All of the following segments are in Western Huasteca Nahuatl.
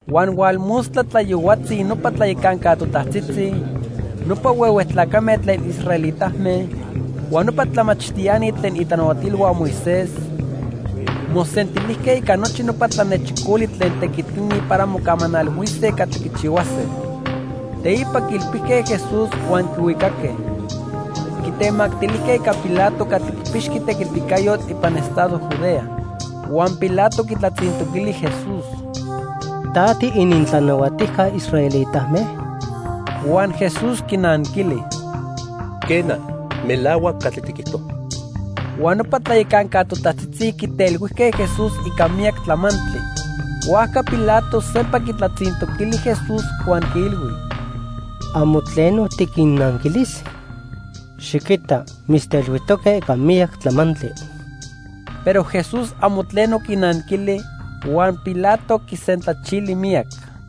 Huan hualmostla tlayohuatzi nopa tlayacanca totajtzitzi, nopa huehue tlacame tlen israelitame, huan nopa tlamachtiani tlen itlanahuatilhua Moisés, mosentilijque ica nochi nopa tlanechicoli tlen tequitini para mocamanalhuise catli quichihuase. Teipa quiilpijque Jesús huan quihuicaque. Quitemactilijque ica Pilato catli quipixqui tequiticayotl ipan estado Judea. Huan Pilato quitlatzintoquili Jesús: —¿Ta tiinintlanahuatijca israelitame? Huan Jesús quinanquili: —Quena. Melahuac catli tiquijto. Huan nopa tlayacanca totajtzitzi quitelhuijque Jesús ica miyac tlamantli. Huajca Pilato sempa quitlatzintoquili Jesús huan quiilhui: —¿Amo tleno tiquinnanquilis? Xiquita, mitztelhuijtoque ica miyac tlamantli. Pero Jesús amo tleno quinanquili, huan Pilato quisentlachili miyac.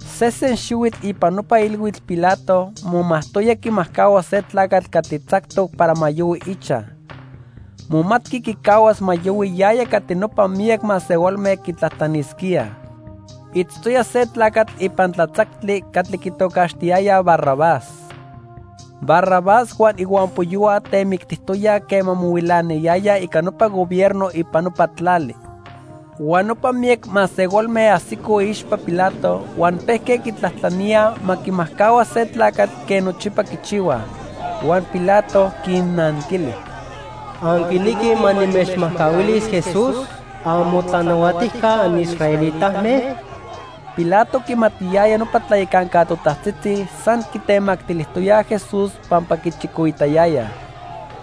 Sesen xihuitl ipan nopa ilhuitl Pilato momajtoya quimajcahua se tlacatl catli tzactoc para ma yohui ichaj. Momatqui quicahuas ma yohui yaya catli nopa miyac masehualme quitlajtlanisquíaj. Itztoya se tlacatl ipan tlatzactli catli quitocaxtiyayaj Barrabás. Barrabás huan ihuampoyohua temictijtoyaj quema mohuilanayayaj ica nopa gobierno ipan nopa tlali. Huan nopa miyac masehualme ajsicoj iixpa Pilato huan pejque quitlajtlaníaj ma quimajcahuas se tlacatl quen nochipa quichihuaj. Huan Pilato quinnanquili: —¿Anquinequij ma nimechmajcahuilis Jesús, amotlanahuatijca anisraelitame? Pilato quimatiyaya nopa tlayacanca totajtzitzi san quitemactilijtoyaj Jesús pampa quichicoitayayaj.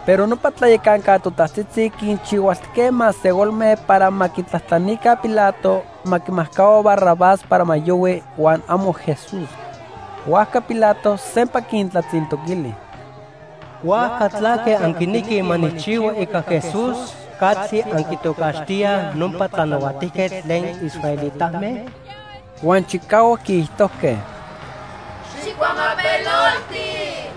Pero nopa tlayacanca totajtzitzi quinchihualtijque masehualme para ma quitlajtlanica Pilato ma quimajcahua Barrabás para ma yohui, huan amo Jesús. Huajca Pilato sempa quintlatzintoquili: —¿Huajca tlaque anquinequij ma nijchihua ica Jesús catli anquitocaxtíaj nopa tlanahuatijquetl tlen israelitame? Huan chicahuac quiijtojque: —¡Xijcuamapelolti!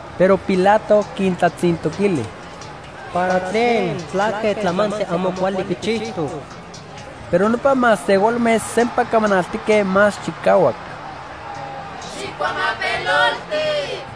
Pero Pilato quintlatzintoquili: —¿Para tlen? ¿Tlaque tlamantli amo cuali quichijtoc? Pero nopa masehualme sempa camanaltique más chicahuac: —¡Xijcuamapelolti!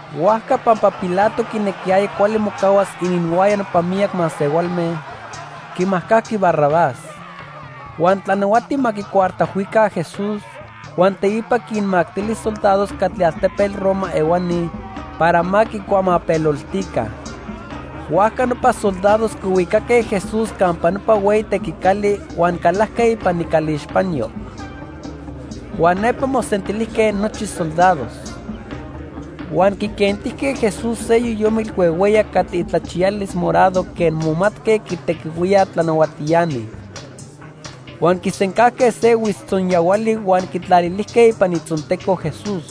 Huajca pampa Pilato quinequiyaya cuali mocahuas ininhuaya nopa miyac masehualme, quimajcajqui Barrabás. Huan tlanahuati ma quicuartajhuica Jesús, huan teipa quinmactili soldados catli altepetl Roma ehuani para ma quicuamapeloltica. Huajca nopa soldados quihuicaque Jesús campa nopa hueyi tequicali huan calajque ipan icalixpanyo. Huan nepa mosentilijque nochi soldados. Huan quiquentijque Jesús se yoyomitl huehueyac catli itlachiyalis morado quen momatque quitequihuíaj tlanahuatiani. Huan quisencajque se huitztzonyahuali huan quitlalilijque ipan itzonteco Jesús.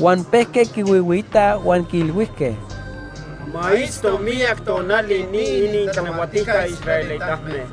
Huan pejque quihuihuiitaj huan quiilhuijque: —¡Ma itzto miyac tonali ni inintlanahuatijca israelitame!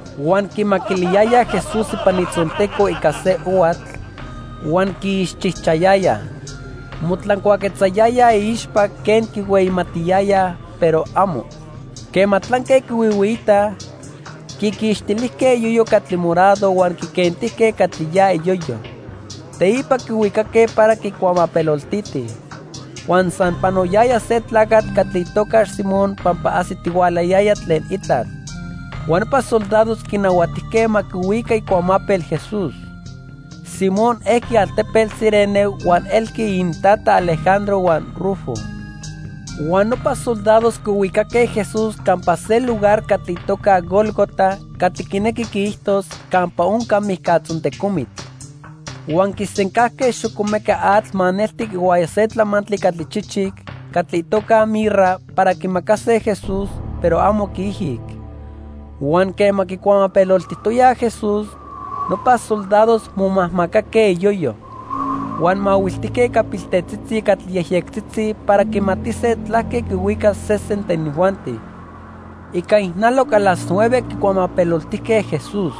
Huan quimaquiliyayaj Jesús ipan itzonteco ica se ohuatl, huan quiixchijchayayaj. Motlancuaquetzayayaj iixpa quen quihueyimatiyayaj, pero amo. Quema tlanque quihuihuiitaj, quiquixtilijque iyoyo catli morado huan quiquentijque catli ya iyoyo. Teipa quihuicaque para quicuamapeloltitij. Huan san panoyaya se tlacatl catli itocax Simón pampa ajsitihualayaya tlen itlal. Huan nopa soldados quinahuatijque ma quihuica icuamapel Jesús. Simón ejqui altepetl Cirene huan elqui inintata Alejandro huan Rufo. Huan nopa soldados quihuicaque Jesús campa se lugar catli itoca Gólgota (catli quinequi quiijtos: "Campa Onca Mijcatzontecomitl"). Huan quisencajque xocomeca atl maneltic ihuaya se tlamantli catli chichic catli itoca mirra para quimacase Jesús, pero amo quiijic. Huan quema quicuamapeloltijtoyaj Jesús, nopa soldados momajmacaque iyoyo. Huan mahuiltijque ica piltetzitzi catli yejyectzitzi para quimatise tlaque quihuicas sesen tlen inijuanti. Ica ijnaloc a las nueve quicuamapeloltijque Jesús.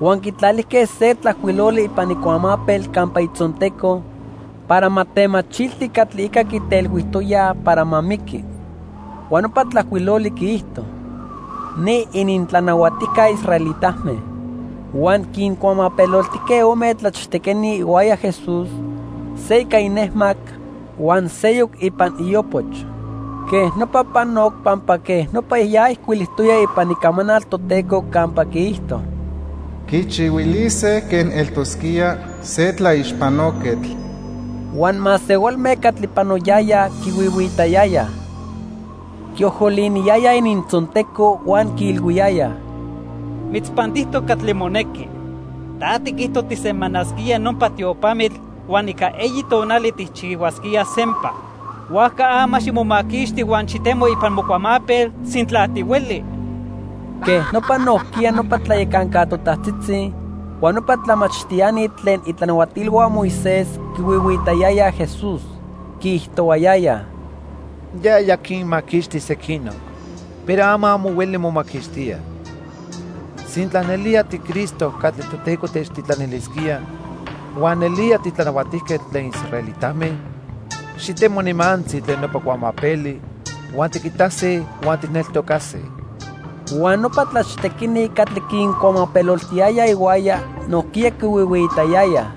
Huan quitlalijque se tlajcuiloli ipan icuamapel campa itzonteco para ma temachilti catli ica quitelhuijtoyaj para ma miqui. Huan nopa tlajcuiloli quiijto:|sc NI ININTLANAHUATIJCA ISRAELITAME|r. Huan quincuamapeloltijque ome tlachtequini ihuaya Jesús, se ica inejmac, huan seyoc ipan iopoch. Quej nopa panoc pampa quej nopa ya ijcuilijtoya ipan Icamanal Toteco campa quiijto: "Quichihuilise quen eltosquía se tlaixpanoquetl." Huan masehualme catli panoyayaj quihuihuiitayayaj. Quiojoliniyayaj inintzonteco huan quiilhuiyayaj: —¡Mitzpantijtoc catli monequi! Ta tiquijto tijsemanasquía nopa tiopamitl huan ica eyi tonali tijchihuasquía sempa. Huajca ama ximomaquixti huan xitemo ipan mocuamapel, sintla tihueli. Quej nopa nojquiya nopa tlayacanca totajtzitzi huan nopa tlamachtiani tlen itlanahuatilhua Moisés quihuihuiitayayaj Jesús. Quiijtohuayayaj: —Yaya quinmaquixti sequinoc, pero ama amo hueli momaquixtía. Sintla nelía tiCristo catli Toteco techtitlanilisquía huan nelía titlanahuatijquetl tlen israelitame, xitemo nimantzi tlen nopa cuamapeli huan tiquitase huan tijneltocase. Huan nopa tlachtequini catli quincuamapeloltiyayaj ihuaya, nojquiya quihuihuiitayayaj.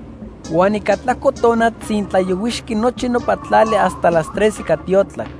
Huan ica tlajco tona tzintlayohuixqui nochi nopa tlali hasta las tres ica tiotlac.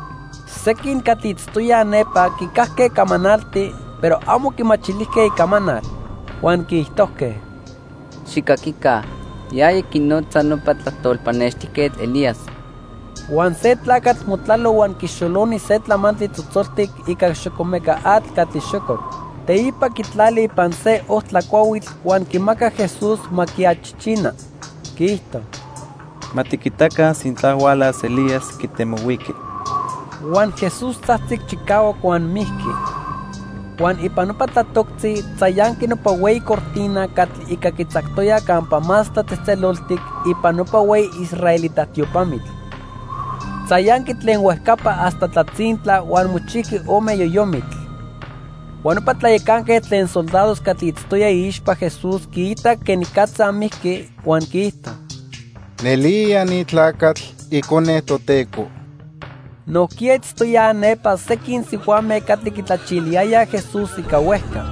Sequin catli itztoyaj nepa quicajque camanalti, pero amo quimachilijque icamanal. Huan quiijtojque: —¡Xijcaquica! Yaya quinotza nopa tlajtol pannextijquetl Elías. Huan se tlacatl motlalo huan quixoloni se tlamantli tzotzoltic ica xocomeca atl catli xococ. Teipa quitlali ipan se ojtla cuahuitl huan quimacac Jesús ma quiachichina. Quiijto: —Ma tiquitaca sintla hualas Elías quitemohuiqui. Huan Jesús tzajtzic chicahuac huan mijqui. Huan ipan nopa tlatoctzi tzayanqui nopa hueyi cortina catli ica quitzactoyaj Campa Más Tlatzejtzeloltic ipan nopa hueyi israelita tiopamitl. Tzayanqui tlen huejcapa hasta tlatzintla huan mochijqui ome yoyomitl. Huan nopa tlayacanquetl tlen soldados catli itztoya iixpa Jesús quiitac quenicatza mijqui, huan quiijto: —Nelía ni tlacatl Icone Toteco. Nojquiya itztoyaj nepa sequin sihuame catli quitlachiliyayaj Jesús ica huejca.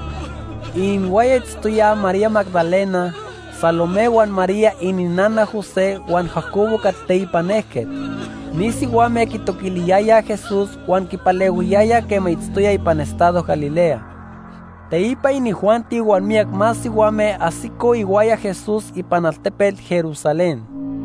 Ininhuaya itztoyaj María Magdalena, Salomé huan María ininnana José huan Jacobo catli teipan ejquetl. Ni sihuame quitoquiliyayaj Jesús huan quipalehuiyayaj quema itztoya ipan estado Galilea. Teipa inijuanti huan miyac más sihuame ajsicoj ihuaya Jesús ipan altepetl Jerusalén.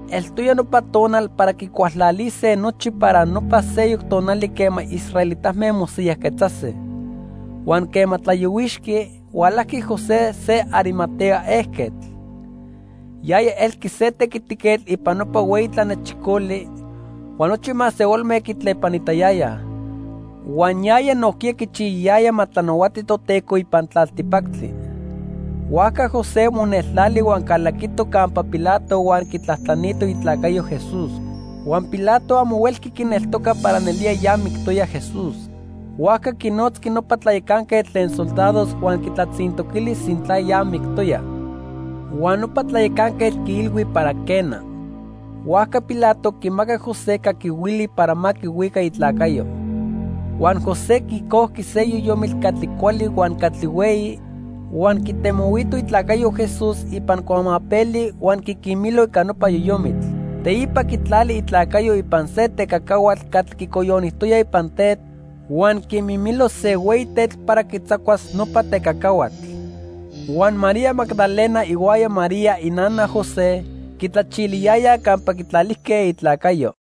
Eltoya nopa tonal para quicualtlalise nochi para nopa seyoc tonali quema israelitame mosiyajquetzase. Huan quema tlayohuixqui, hualajqui José se Arimatea ejquetl. Yaya elqui se tequitiquetl ipan nopa hueyi tlanechicoli huan nochi masehualme quitlepanitayayaj. Huan yaya nojquiya quichiyayaya ma tlanahuati Toteco ipan tlaltipactli. Huajca José moneltlali huan calaquito campa Pilato huan quitlajtlanito itlacayo Jesús. Huan Pilato amo huelqui quineltoca para nelía ya mictoya Jesús. Huajca quinotzqui nopa tlayacanquetl tlen soldados huan quitlatzintoquili sintla ya mictoya. Huan nopa tlayacanquetl quiilhui para quena. Huajca Pilato quimacac José caquihuili para ma quihuica itlacayo. Huan José quicojqui se yoyomitl catli cuali huan catli hueyi, huan quitemohuito itlacayo Jesús ipan cuamapeli huan quiquimilo ica nopa yoyomitl. Teipa quitlali itlacayo ipan se tecacahuatl catli quicoyonijtoya ipan tetl huan quimimilo se hueyi tetl para quitzacuas nopa tecacahuatl. Huan María Magdalena ihuaya María inana José quitlachiliyayaj campa quitlalijque itlacayo.